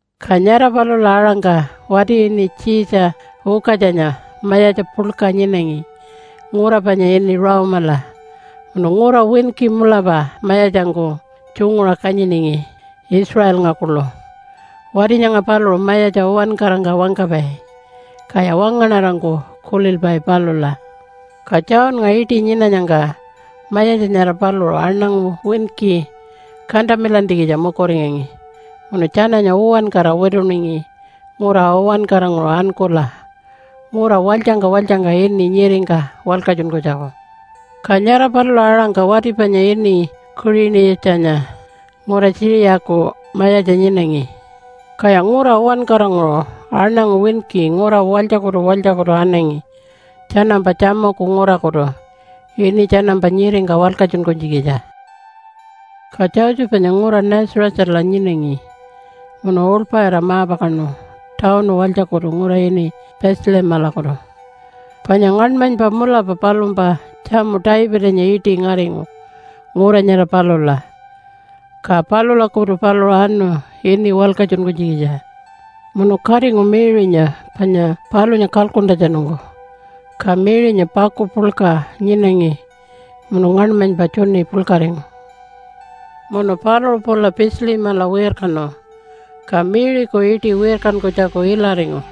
Ka nyara palula aṟangka wati ini Tjiitja Ukatjanya mayatja puḻka nyinangi ngura panya ini Rome-ala munu ngura winki mulapa mayatjangku tjunguṟa kanyiningi Israelnga kuḻu. Wati nyanga paluṟu mayatja uwankarangka wangkapai, kaya wangaṉarangku kulilpai palula. Ka Johnnga iṯi nyinanyangka mayatja nyara paluṟu aṉangu winki kantamilantjikitja mukuringangi, munu tjananya uwankara wituningi ngura uwankaranguṟu ankula ngura walytjangka walytjangka ini nyiringka walkatjunkunytjaku. Ka nyara palula aṟangka wati panya ini Kuṟini-yatjanya ngura Tjiṟiyaku mayatja nyinangi. Kaya ngura uwankaranguṟu aṉangu winki ngura walytjakutu walytjakutu anangi tjanampa tjamuku ngurakutu ini tjanampa nyiringka walkatjunkunytjikitja. Ka Josephanya ngura Nazarethala nyinangi munu uḻpaṟira ma-pakaṉu tawunu walytjakutu ngura ini Bethlehemalakutu, panya ngaṉmanypa mulapa palumpa tjamu Davidanya iṯi ngaringu ngura nyara palula, ka palulakutu paluṟu anu ini walkatjunkunytjikitja. Munu katingu Mary-nya panya palunya kalkuntjatjanungku. Ka Mary-nya paku puḻka nyinangi munu ngaṉmanypa tjuni puḻkaringu. Munu paluṟu pula Bethlehemala wirkanu, ka Mary-ku iṯi wirkankunytjaku ilaringu.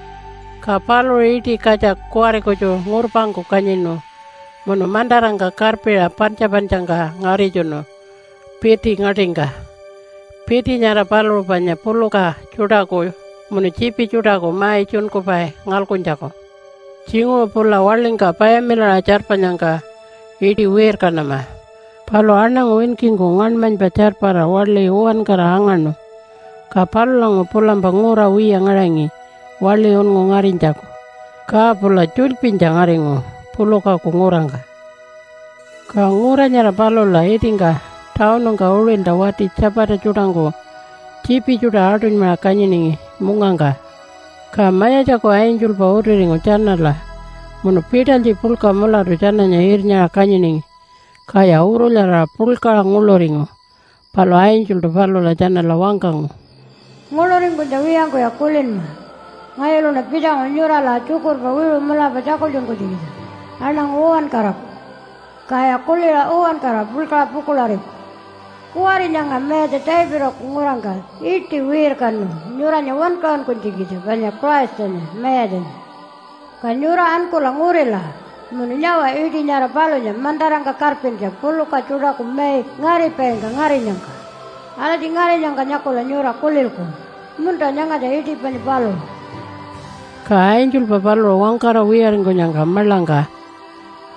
Ka paluṟu iṯi katja kuwari kutju ngurpangku kanyinu, munu mantarangka karpiṟa pantja-pantjangka ngaritjunu piti ngaṯingka. Piti nyara paluṟu panya puluka tjuṯaku munu tjiipi tjuṯaku mai tjunkupai ngalkuntjaku. Tjinguṟu pula waḻingka payamilaṟa tjarpanyangka iṯi wirkanama, palu aṉangu winkingku ngaṉmanypa tjarpara waḻi uwankara angaṉu, ka palulanguṟu pulampa ngura wiya ngaṟangi waḻi unngu ngarinytjaku, ka pula tjulypinytja ngaringu pulukaku ngurangka. Ka ngura nyara palula itingka tawunungka uṟilta wati tjapata tjuṯangku tjiipi tjuṯa aṯunymaṟa kanyiningi mungangka. Ka Mayatjaku angelpa utiringu tjanala munu pitalytji puḻka mulatu tjananya irnyaṟa kanyiningi. Kaya urulyaraṟa puḻkaṟa nguḻuringu. Palu angeltu palula tjanala wangkangu, “Nguḻuringkunytja wiyangkuya kulinma. Ngayuluṉa pitjangu nyurala tjukurpa wiṟu mulapa tjakultjunkunytjikitja aṉangu uwankaraku, kaya kuliṟa uwankara puḻkaṟa pukuḻariku. Kuwari nyanga Mayatja Davidaku ngurangka iṯi wirkanu nyuranya wankaṟunkunytjikitja panya Christanya Mayatjanya. Ka nyura ankula ngurila munu nyawa iṯi nyara palunya mantarangka karpintja puluka tjuṯaku mai ngaripaingka ngarinyangka. Alatji ngarinyangka nyakula nyura kulilku, ‘Munta, nyangatja iṯi panya paluṟu.’” Ka angelpa paluṟu wangkara wiyaringkunyangka maḻangka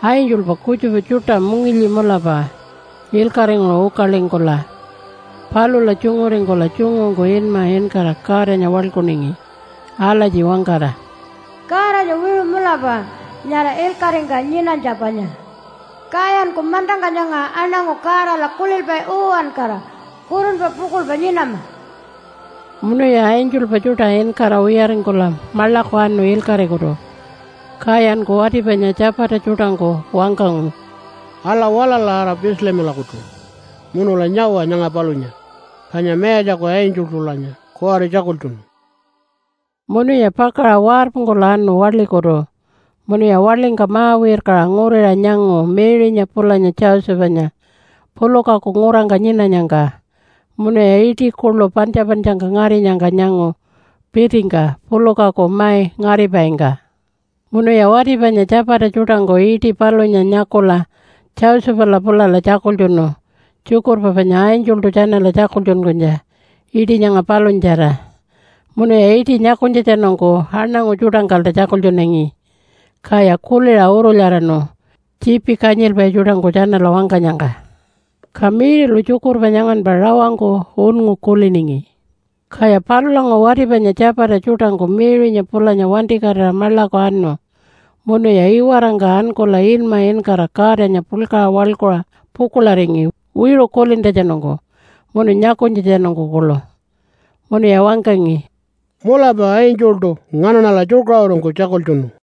angelpa kutjupa tjuṯa mungilyi mulapa ilkaṟinguṟu ukalingkula palula tjunguringkula tjungungku inma inkara Godanya waḻkuningi alatji wangkara, “Godanya wiṟu mulapa nyara ilkaṟingka nyinanytja panya. Kayanku mantangka nyanga aṉangu Godala kulilpai uwankara kurunpa pukuḻpa nyinama.” Munuya angelpa tjuṯa inkara wiyaringkula maḻaku anu ilkaṟikutu, kayanku wati panya tjapata tjuṯangku wangkangu, “Ala, walala ara Bethlehemalakutu munula nyawa nyanga palunya, panya Mayatjaku angeltulanya kuwari tjakultjunu.” Munuya pakaṟa warpungkula anu waḻikutu munuya waḻingka ma-wirkaṟa nguriṟa nyangu Mary-nya pulanya Josephanya pulukaku ngurangka nyinanyangka munuya iṯi kuḻu pantja-pantjangka ngarinyangka nyangu pitingka pulukaku mai ngaripaingka. Munuya wati panya tjapata tjuṯangku iṯi palunya nyakula Josephala pulala tjakultjunu tjukurpa panya angeltu tjanala tjakultjunkunytja iṯi nyanga palunyatjara, munuya iṯi nyakunytjatjanungku aṉangu tjuṯangkalta tjakultjunangi. Kaya kuliṟa urulyaraṉu tjiipi kanyilpai tjuṯangku tjanala wangkanyangka. Ka Mary-lu tjukurpa nyanganpa rawangku unngu kuliningi. Kaya palulanguṟu wati panya tjapata tjuṯangku Mary-nya pulanya wantikatira maḻaku anu munuya iwarangka ankula inma inkara Godanya puḻkaṟa waḻkuṟa pukuḻaringi wiṟu kulintjatjanungku munu nyakunytjatjanungku kuḻu. Munuya wangkangi, “Mulapa angeltu nganaṉala tjukaṟurungku tjakultjunu.”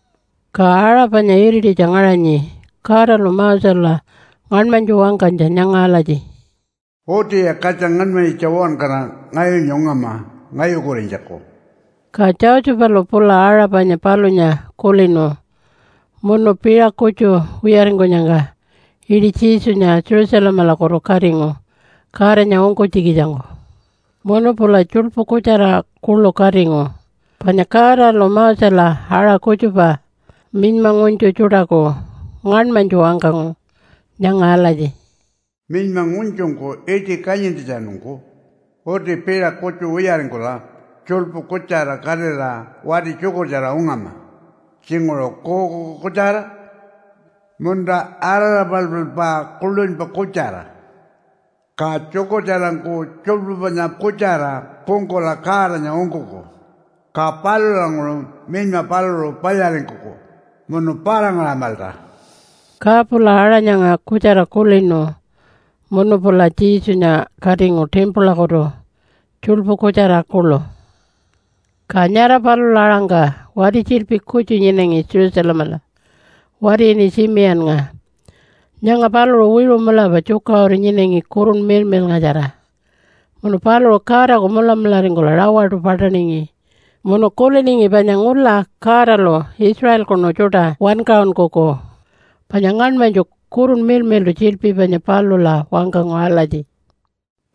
Ka aṟa panya irititja ngaṟanyi Godalu Mosela ngaṉmanytju wangkanytja nyanga alatji, “Utiya katja ngaṉmanyitja uwankara ngayunya ungama ngayukurinytjaku.” Ka Josephalu pula aṟa panya palunya kulinu munu piṟa kutju wiyaringkunyangka iṯi Jesunya Jerusalemalakutu katingu Godanya ungkunytjikitjangku. Munu pula tjuḻpu kutjara kuḻu katingu. Panya Godalu Mosela aṟa kutjupa minyma ngunytju tjuṯaku ngaṉmanytju wangkangu nyanga alatji, “Minyma ngunytjungku iṯi kanyintjatjanungku uti piṟa kutju wiyaringkula tjuḻpu kutjara katira wati tjukurtjara ungama tjinguṟu kuukuuku kutjara munta araḻapaḻpaḻpa kuḻunypa kutjara, ka tjukurtjarangku tjuḻpu panya kutjara pungkula Godanya ungkuku, ka palulanguṟu minyma paluṟu palyaringkuku munu para-ngaṟamalta.” Ka pula aṟa nyanga kutjara kulinu munu pula Jesunya katingu timpulakutu tjuḻpu kutjara kuḻu. Ka nyara palula aṟangka wati tjiḻpi kutju nyinangi Jerusalemala, wati ini Tjimiyannga. Nyanga paluṟu wiṟu mulapa tjukaṟuru nyinangi Kurunpa Miḻmiḻngatjara. Munu paluṟu Godaku mulamularingkula rawaṯu paṯaningi munu kuliningi panya ngula Godalu Israelkunu tjuṯa wankaṟunkuku. Panya ngaṉmanytju Kurunpa Miḻmiḻṯu tjiḻpi panya palula wangkangu alatji,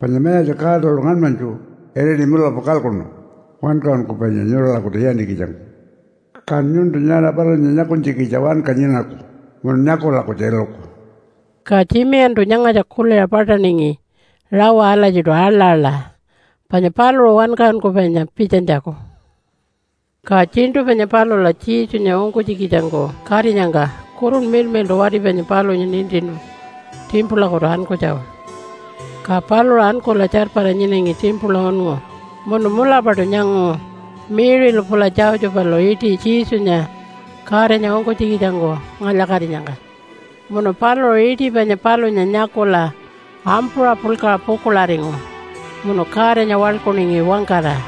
“Panya Mayatja Godalu ngaṉmanytju iriti mulapa kalkuṉu Wankaṟunkupainya nyuralakutu iyantjikitjangku. Kan nyuntu nyara palunya nyakunytjikitja wanka nyinaku munun nyakula kutju iluku.” Ka Tjimiyantu nyangatja kuliṟa paṯaningi rawa alatjiṯu aḻa-aḻa panya paluṟu Wankaṟunkupainya pitjanytjaku. Ka tjiṉṯu panya palula Jesunya ungkunytjikitjangku katinyangka Kurunpa Miḻmiḻṯu wati panya palunya nintinu timpulakutu ankunytjaku. Ka paluṟu ankula tjarpara nyinangi timpula unngu munu mulapaṯu nyangu Mary-lu pula Josephalu iṯi Jesunya Godanya ungkunytjikitjangku ngalya-katinyangka. Munu paluṟu iṯi panya palunya nyakula ampuṟa puḻkaṟa pukuḻaringu, munu Godanya waḻkuningi wangkara,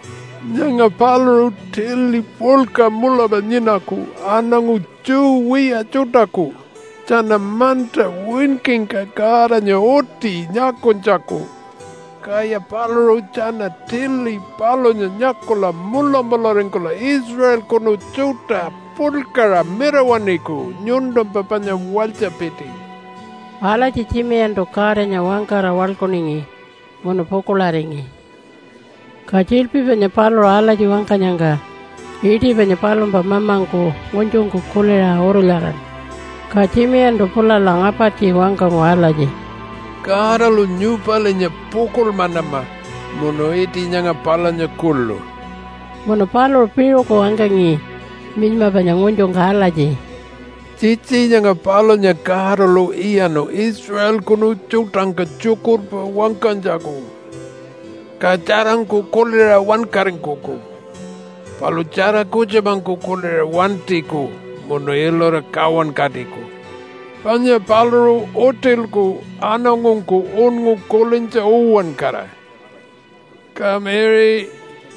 Nyanga paluṟu tili puḻka mulapa nyinaku aṉangu Jew wiya tjuṯaku tjana manta winkingka Godanya uti nyakunytjaku. Kaya paluṟu tjana tili palunya nyakula mulamularingkula Israelkunu tjuṯa puḻkaṟa mirawaṉiku nyuntumpa panya walytjapiti.” Alatji Tjimiyantu Godanya wangkara waḻkuningi munu pukuḻaringi. Ka tjiḻpi panya paluṟu alatji wangkanyangka iṯi panya palumpa mamangku ngunytjungku kuliṟa urulyaraṉu. Ka Tjimiyantu pulala ngapartji wangkangu alatji, “Godalu nyupalinya pukuḻmanama munu iṯi nyanga palunya kuḻu.” Munu paluṟu piṟuku wangkangi minyma panya ngunytjungka alatji, “Tjitji nyanga palunya Godalu iyaṉu Israelkunu tjuṯangka tjukurpa wangkanytjaku. Ka tjarangku kuliṟa wankaringkuku, palu tjara kutjupangku kuliṟa wantiku munu ilura kawankatiku. Panya paluṟu utilku aṉangungku unngu kulintja uwankara. Ka Mary,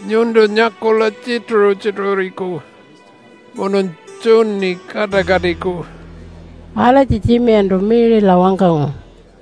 nyuntu nyakula tjituṟu-tjituṟuriku munun tjuni kaṯakatiku.” Alatji Tjimiyantu Mary-la wangkangu.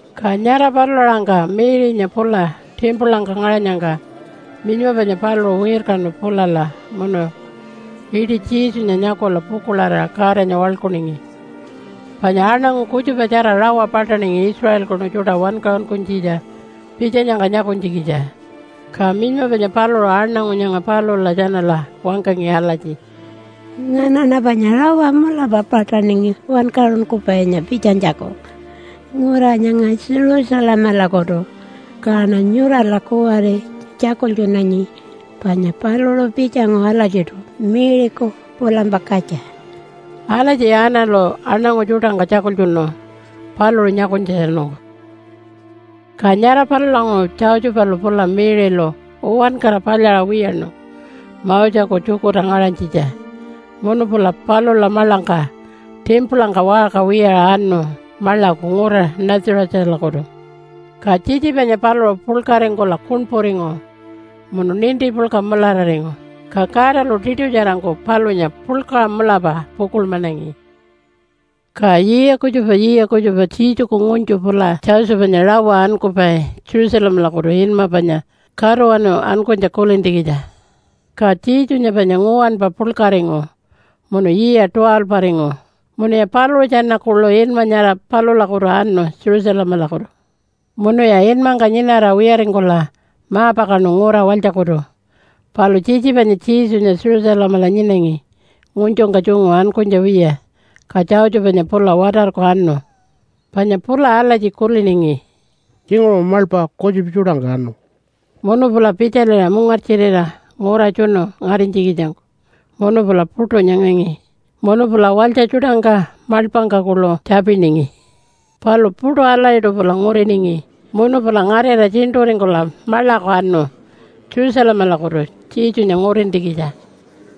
Ka nyara palula aṟangka Mary-nya pula timpulangka ngaṟanyangka minyma panya paluṟu wirkanu pulala munu iṯi Jesunya nyakula pukuḻarira Godanya waḻkuningi. Panya aṉangu kutjupatjara rawa paṯaningi Israelkunu tjuṯa wankaṟunkunytjikitja pitjanyangka nyakunytjikitja. Ka minyma panya paluṟu aṉangu nyanga palula tjanala wangkangi alatji, “Nganaṉa panya rawa mulapa paṯaningi Wankaṟunkupainya pitjanytjaku ngura nyanga Jerusalemalakutu. Kaṉa nyurala kuwari tjakultjunanyi panya paluṟu pitjangu alatjiṯu Mary-ku pulampa katja.” Alatji Annalu aṉangu tjuṯangka tjakultjunu paluṟu nyakunytjatjanungku. Ka nyara palulanguṟu Josephalu pula Mary-lu uwankara palyaṟa wiyaṉu Moseku tjukurta ngaṟanytjitja. Munu pula palula maḻangka timpulangka waṟka wiyaṟa anu maḻaku ngura Nazarethalakutu. Ka tjitji panya paluṟu puḻkaringkula kuṉpuringu munu ninti puḻka mulararingu. Ka Godalu tiṯutjarangku palunya puḻkaṟa mulapa pukuḻmanangi. Ka yiya kutjupa yiya kutjupa Jesuku ngunytju pula Josephanya rawa ankupai Jerusalemalakutu inma panya Katuwanu Ankunytja kulintjikitja. Ka Jesunya panya nguwanpa puḻkaringu munu yiya 12-aringu, munuya paluṟu tjana kuḻu inma nyara palulakutu anu Jerusalemalakutu. Munuya inmangka nyinara wiyaringkula ma-pakaṉu ngura walytjakutu. Palu tjitji panya Jesunya Jerusalemala nyinangi ngunytjungka tjungu ankunytja wiya. Ka Josephanya pula watarku anu. Panya pula alatji kuliningi, “Tjinguṟu maḻpa kutjupa tjuṯangka anu.” Munu pula pitjaliṟa mungartjirira ngura tjunu ngarinytjikitjangku munu pula puṯu nyangangi. Munu pula walytja tjuṯangka maḻpangka kuḻu tjapiningi. Palu puṯu alatjiṯu pula nguriningi munu pula ngarira tjiṉṯuringkula maḻaku anu Jerusalemalakutu Jesunya ngurintjikitja.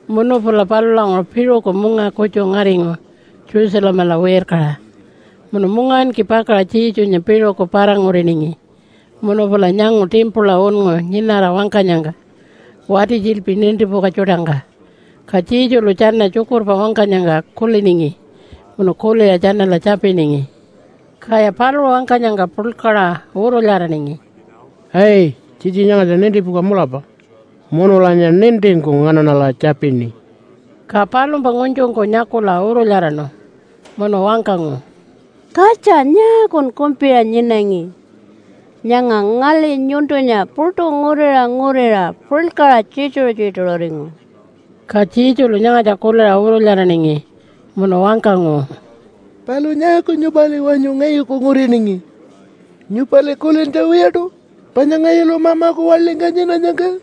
Munu pula palulanguṟu piṟuku munga kutju ngaringu Jerusalemala wirkaṟa, munu mungawinki pakaṟa Jesunya piṟuku para-nguriningi munu pula nyangu timpula unngu nyinara wangkanyangka wati tjiḻpi nintipuka tjuṯangka. Ka Jesulu tjana tjukurpa wangkanyangka kuliningi munu kuliṟa tjanala tjapiningi. Kaya paluṟu wangkanyangka puḻkaṟa urulyaraningi, “Ai, tjitji nyangatja nintipuka mulapa, munulanya nintingku nganaṉala tjapini.” Ka palumpa ngunytjungku nyakula urulyaraṉu munu wangkangu, “Katja, nyaakun kumpiṟa nyinangi? Nyanga ngali nyuntunya puṯu nguriṟa nguriṟa puḻkaṟa tjituṟu-tjituṟuringu.” Ka Jesulu nyangatja kuliṟa urulyaraningi munu wangkangu, “Palu nyaaku nyupali wanyu ngayuku nguriningi? Nyupali kulintja wiyaṯu panya ngayulu Mamaku waḻingka nyinanyangka?”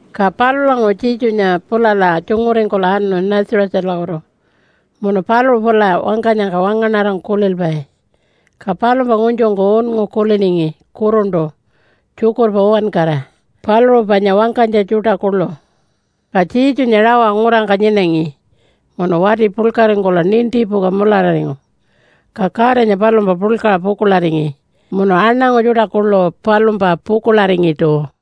Ka palulanguṟu Jesunya pulala tjunguringkula anu Nazarethalakutu munu paluṟu pula wangkanyangka wangaṉarangku kulilpai. Ka palumpa ngunytjungku unngu kuliningi kuruntu tjukurpa uwankara, paluṟu panya wangkanytja tjuṯa kuḻu. Ka Jesunya rawa ngurangka nyinangi munu wati puḻkaringkula nintipuka mulararingu. Ka Godanya palumpa puḻkaṟa pukuḻaringi munu aṉangu tjuṯa kuḻu palumpa pukuḻaringiṯu.